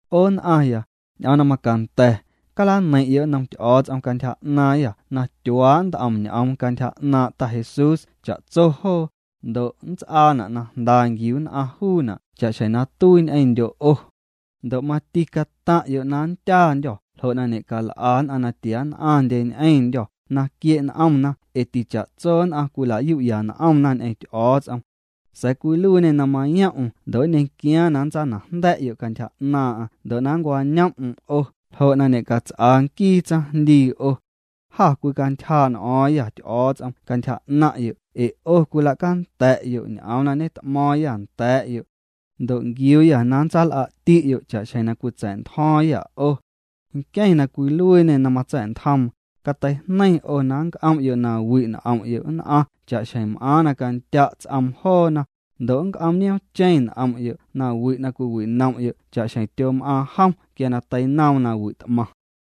'O nn'aⁿya, ñ'oom na macanda̱, calaneiⁿ'yo' nnom Ty'o̱o̱ts'om cantyja 'naaⁿyâ na tyuaa' nt'om ñ'oom cantyja 'naaⁿ' Ta Jesús cha'tso joo, ndo' nnts'aana' na jnda nquiu nn'aⁿ juuna' cha'xjeⁿ na tuii ñ'eⁿndyo' 'o. Ndo' mati cataⁿ'yo' na nndyaandyô̱ ljo' na ñe'cal'a nn'aⁿ na tia nn'aⁿndye ñ'eⁿndyô̱ na quie' n'omna ee ticha'tso nn'aⁿ cwilayu'ya n'omna ñ'eⁿ Ty'o̱o̱ts'om. Sa̱a̱ cwiluiiñê na mayom'm ndo' nñequiaaⁿ na nntsaanajnda̱'yo' cantyja 'naaⁿ'aⁿ ndo' na nncwañoom'm 'o ljo' ñe'cats'aa nquii tsaⁿjndii 'o. Jâ cwicantyjaa' n'o̱o̱ⁿyâ Ty'o̱o̱ts'om cantyja 'naⁿ'yo' ee 'o cwila'canda̱'yo' ñ'oom na ñet'mo̱o̱ⁿyâ nda̱a̱'yo'. Ndo' nquiuuyâ na ntsal'a'ti'yo' cha'xjeⁿ na cwitsa̱'ntjo̱o̱ⁿyâ 'o. Nqueⁿ na cwiluiiñê na matsa̱'ntjoom, cateijneiⁿ 'o na nnc'om'yo' na wi' n'om'yo' nn'aⁿ cha'xjeⁿ m'aaⁿ na candya' ts'oom joona, ndo' na nnc'om nioomcheⁿ n'om'yo' nawi' na cwiwinom'yo' cha'xjeⁿ tyom'aaⁿ jom quia na teinoom nawi' t'maⁿ.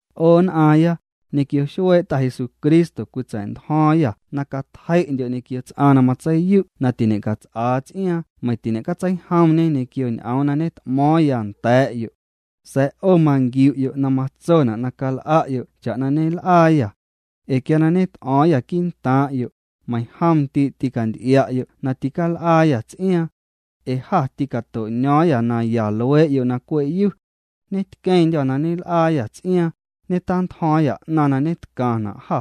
'O nn'aaⁿya, ñequio xuee' Ta Jesucristo cwitsa̱'ntjo̱o̱ⁿyâ na catjei'ndyo' ñequio ts'aⁿ na matseiyu' na tiñe'cats'aa ts'iaaⁿ meiⁿ tiñe'tseijomñe ñequio ñ'oom na ñet'mo̱o̱ⁿya nda̱a̱'yo'. Sa̱a̱ 'o manquiu'yo' na matsona' na cal'a'yo' cha'na ñel'aayâ. Ee quia na ñet'o̱o̱ⁿyâ quii'ntaaⁿ'yo', meiⁿjom ndii' tîcanty'ia'yo' na tîcal'aayâ ts'iaaⁿ. Ee jâ tîcato'ño̱o̱ⁿyâ naya luee'yo' na cwe'yu. Ñetqueⁿndyô̱ na ñel'aayâ ts'iaaⁿ, ñetantjo̱o̱ⁿyâ 'naⁿ na ñetcaⁿna' jâ.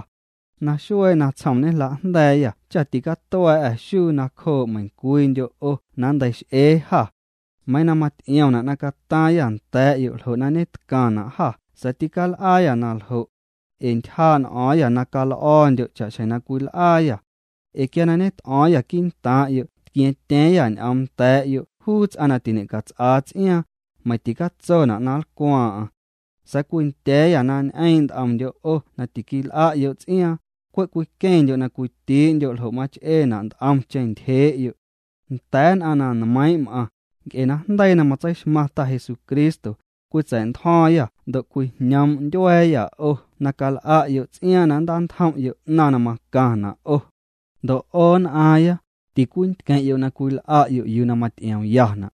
Naxuee natsjom ñejla'jnda̱a̱yâ cha ticatua̱a̱'â xuu nacjoo' meiⁿcwiindyo' 'o na nnteix'ee jâ. Meiiⁿ na maty'iomna' na cataaⁿyâ nda̱a̱'yo' ljo' na ñetcaⁿna' jâ sa̱a̱ tîcal'aayâ na ljo'. Ee ntyjaa' n'o̱o̱ⁿyâ na cal'o̱o̱ndyo' cha'xjeⁿ na cwil'aayâ. Ee quia ñet'o̱o̱ⁿyâ quii'ntaaⁿ'yo' tquia̱ⁿtya̱a̱ⁿyâ ñ'oom nda̱a̱'yo' juu ts'aⁿ na tiñe'cats'aa ts'iaaⁿ, meiⁿ ticatsona' na nlcwaaⁿ'aⁿ. Sa̱a̱ cwindya̱a̱yâ na ñ'eeⁿ' nt'omndyo' 'o na tiquil'a'yo' ts'iaaⁿ, cwe' cwiqueⁿndyo' na cwitii'ndyo' ljo' mach'eena' nt'omcheⁿ ntyjee'yo'. Nda̱a̱ nn'aⁿ na nmeiiⁿ' m'aⁿ, nc'e najndeii na matseixmaⁿ Ta Jesucristo, cwitsa̱'ntjo̱o̱ⁿyâ ndo' cwijñoom' ntyua̱a̱yâ 'o na cal'a'yo' ts'iaaⁿ na nntantjom'yo' 'naⁿ na macaⁿna' 'o. Ndo' 'o, nn'aaⁿya, ticwintqueⁿ'yo' na cwil'a'yo' yuu na maty'iomyana'.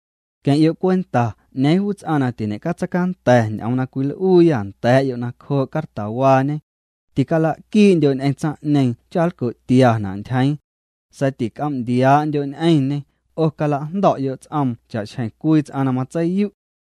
Queⁿ'yo' cwenta 'ñeeⁿ juu ts'aⁿ na tiñe'catseicanda̱ ñ'oom na cwil'uuyâ nda̱a̱'yo' nacjoo' cartawaañe. Ticala'quii'ndyo' ñ'eⁿ tsaⁿ'ñeeⁿ cha nlco'tiana' ntyjeeⁿ. Sa̱a̱ tinc'om ndiaa'ndyo' ñ'eⁿñê, 'o cala'jndo̱'yo' ts'oom cha'xjeⁿ cwii ts'aⁿ na matseiyu'.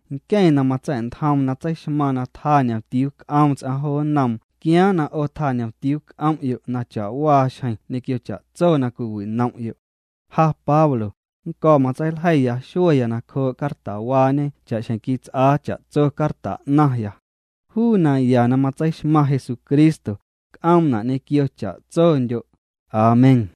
Nqueⁿ na matsa̱'ntjoom na tseixmaaⁿ na tjaa ñomtiuu c'oom ts'aⁿ jo nnoom quiaaⁿ na 'o tjaa ñomtiuu c'om'yo' na cha'waa xjeⁿ ñequio cha'tso na cwiwinom'yo'. Ja Pablo, nnco̱ matseiljeiya xueya nacjoo' cartawaañe cha'xjeⁿ quits'aa cha'tso carta 'naⁿya. Juu naya na matseixmaⁿ Jesucristo, c'oomna' ñequio cha'tsondyo'. Amén.